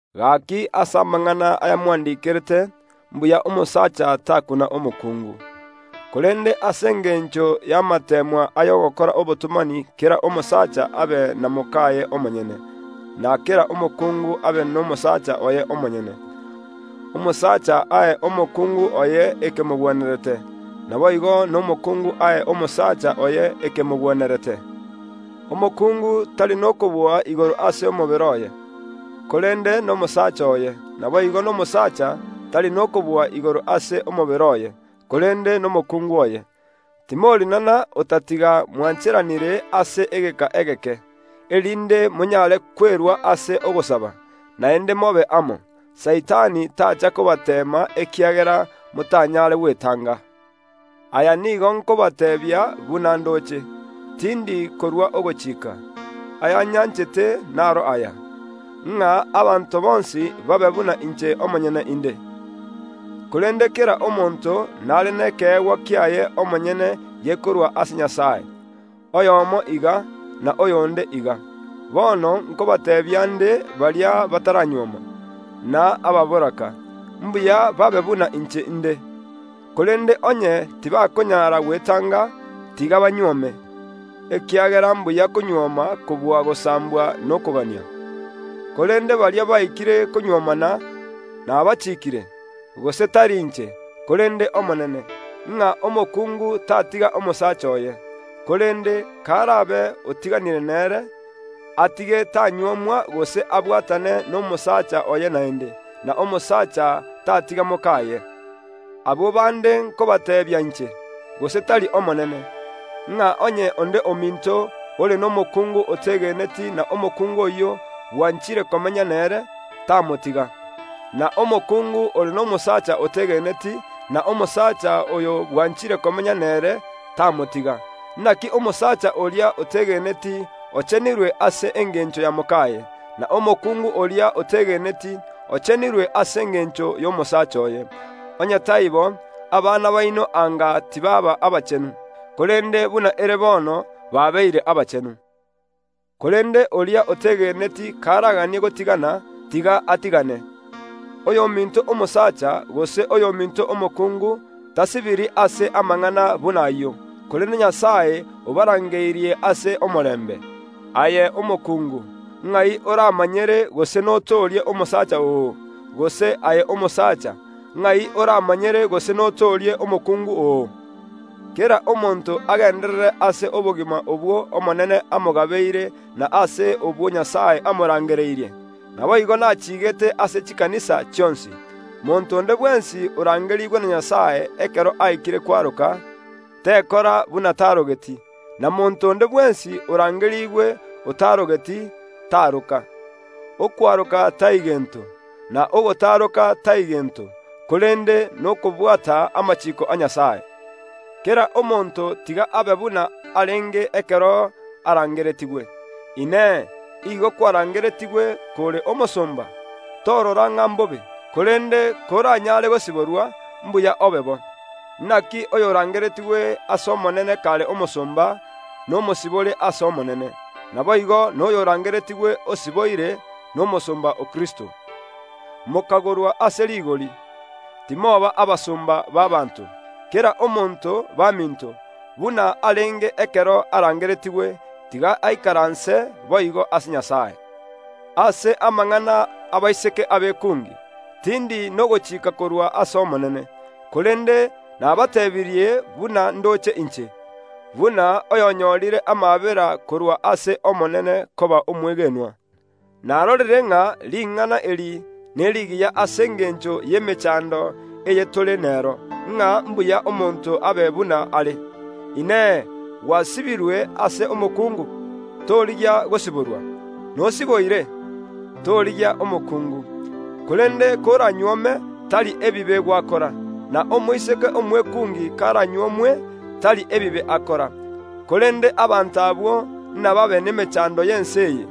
Gaki ase amang’ana aya mwandikerete, mbuya omosacha takuna omokungu. Korende ase engencho y’amateemwa ay’ogokora obotomani kera omosacha abe na mokaye omonyene, na kera omokungu abe nomosaacha oye omonyene. Omosacha ae omokungu oye ekemogwenerete; naboigo nomokuungu ae omosacha oye ekemogwenerete. Omokungu tari nokobua igoro ase omobere oye, korende nomosaacha oye; naboigo nomosaacha tari nokobua igoro ase omobere oye, korende nomokuungu oye. Timorinana otatiga mwancheranire ase egeka egeke, erinde monyare kwerua ase ogosaba; naende mobe amo, Saitani tacha kobateema ekiagera motanyare gwetanga. Aya nigo nkobateebia buna ndoche; tindi korua ogochika. Ayanyanchete naro aya, ng’a abanto bonsi babe buna inche omonyene inde. Korende kera omonto nare nekeegwa kiaye omonyene gekorwa ase Nyasae, oyomo iga, na oyonde iga. Bono nkobateebia nde baria bataranyuoma, na ababoraka, mbuya babe buna inche inde. Korende onye tibakonyara gwetanga, tiga banyuome, ekiagera mbuya konyuoma kobua gosambwa nokogania. Korende baria baikire konyuomana nabachiikire, gose tari inche, korende Omonene, ng’a omokungu tatiga omosacha oye, (korende, karabe otiganire nere, atige tanyuomwa gose abwatane nomosaacha oye naende), na omosacha tatiga mokaye. Abwo bande nkobateebia inche, gose tari Omonene, ng’a onye onde ominto ore nomokuungu otegeneti na omokungu oyio bwanchire komenya nere, tamotiga. Na omokungu ore nomosaacha otegeneti, na omosacha oyo bwanchire komenya nere, tamotiga. Naki omosacha oria otegeneti ochenirwe ase engencho ya mokaye, na omokungu oria otegeneti ochenirwe ase engencho y’omosaacha oye. Onye taibo, abana baino anga tibaaba abachenu; korende buna ere bono, babeire abachenu. Korende oria otegeneti karaganie gotigana, tiga atigane. Oyominto omosacha gose oyominto omokungu tasibiri ase amang’ana buna ayio, korende Nyasae obarangeirie ase omorembe. Aye omokungu, ng’ai oramanyere gose notoorie omosacha oo? Gose aye omosacha, ng’ai oramanyere gose notoorie omokungu oo? Kera omonto agenderere ase obogima obw’Omonene amogabeire na ase obwo Nyasae amorangereirie. Naboigo nachigete ase chikanisa chionsi. Monto onde bwensi orangerigwe na Nyasae ekero aikire kwaroka, tekora buna tarogeti, na monto onde bwensi orangerigwe otarogeti, taroka. Okwaroka tai gento, na ogotaroka tai gento, korende nokobwata amachiiko a Nyasae. Kera omonto tiga abe buna arenge ekero arangeretigwe. Inee! Igo kwarangeretigwe kore omosomba? Torora ng’a mbobe; korende koranyare gosiborwa, mbuya obe bo. Naki oyorangeretigwe ase Omonene kare omosomba, nomosibore ase Omonene. Naboigo noyorangeretigwe osiboire, nomosomba o Kristo. Mokagorwa ase rigori, timoba abasomba b’abaanto. Kera omonto, baminto, buna arenge ekero arangeretigwe, tiga aikaranse boigo ase Nyasae. Ase amang’ana ’abaiseke abekungi, tindi nogochika korwa ase Omonene, korende nabateebirie buna ndoche inche, buna oyonyorire amaabera korwa ase Omonene koba omwegenwa. Narorire ng’a ring’ana eri nerigiya ase engencho y’emechando eye tore nero, ng’a mbuya omonto abe buna are. Inee! Gwasibirwe ase omokungu? Torigia gosiborwa. Nosiboire? Torigia omokungu. Korende koranyuome, tari ebibe gwakora; na omoiseke omwekungi karanyuomwe, tari ebibe akora. Korende abanto abwo nababe nemechando y’ense eye,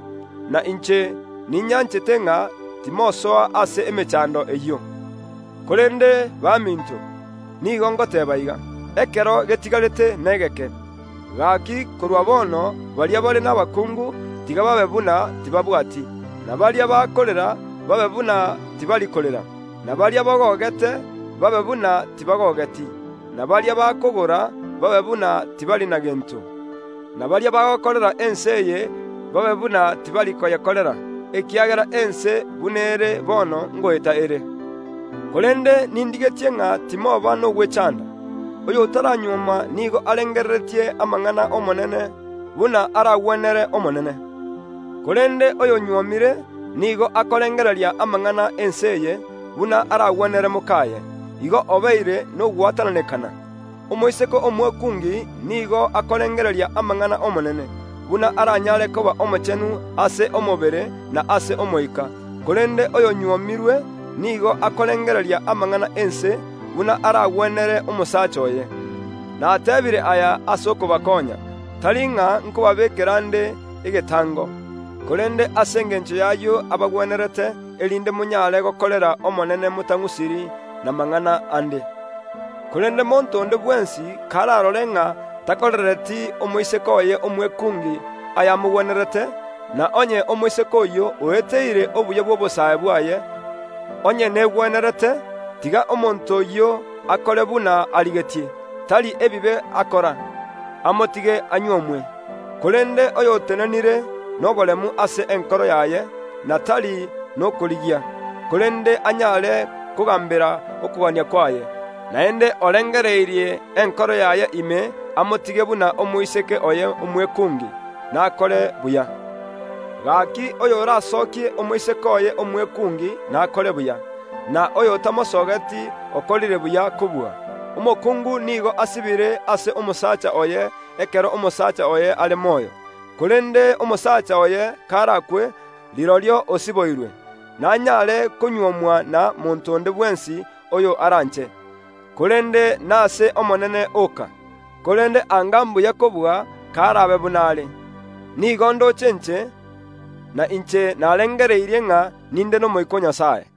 na inche ninyanchete ng’a timosoa ase emechando eyio. Korende baminto, nigo ngoteeba iga: Ekero getigarete negeke; gaki korwa bono baria bare nabakungu, tiga babe buna tibaabwati; na baria bakorera babe buna tibari korera; na baria bagogete babe buna tibagogeti: na baria bakogora babe buna tibari na gento; na baria bagokorera ense eye babe buna tibari koyekorera, ekiagera ense buna ere bono ngoeta ere. Korende nindigetie ng’a timoba nogwechanda. Oyotaranyuoma nigo arengereretie amang’ana ’Omonene, buna aragwenere Omonene: korende oyonyuomire nigo akorengereria amang’ana ’ense eye, buna aragwenere mokaye; igo obeire nogwatananekana. Omoiseke omwekungi nigo akorengereria amang’ana ’Omonene, buna aranyare koba omochenu ase omobere na ase omoika, korende oyonyuomirwe nigo akorengereria amang’ana ’ense, buna aragwenere omosacha oye. Nateebire aya ase okobakonya; tari ng’a nkobabeekera nde egetango, korende ase engencho y’ayio abagwenerete, erinde monyare gokorera Omonene motang’usiri namang’ana ande. Korende monto onde bwensi kararore ng’a takorereti omoiseke oye omwekungi ayamogwenerete, na onye omoiseke oyio oeteire obuya bw’obosae bwaye, onye negwenerete, tiga omonto oyio akore buna arigetie; tari ebibe akora, amotige anyuomwe. Korende oyotenenire noboremu ase enkoro yaye, na tari nokorigia, korende anyare kogambera okogania kwaye, naende orengereirie enkoro yaye ime amotige buna omoiseke oye omwekungi, nakore buya. Gaki oyoranyuome omoiseke omwekungi nakore buya; na oyotamonyuome okorire buya kobua. Omokungu nigo asibire ase omosacha oye ekero omosacha oye are moyo, korende omosacha oye karakwe, rirorio osiboirwe; nanyare konyuomwa na monto onde bwensi oyo aranche, korende nase Omonene oka. Korende anga mbuya kobua karabe buna are. Nigo ndoche inche; na inche narengereirie ng’a ninde n’Omoika o Nyasae.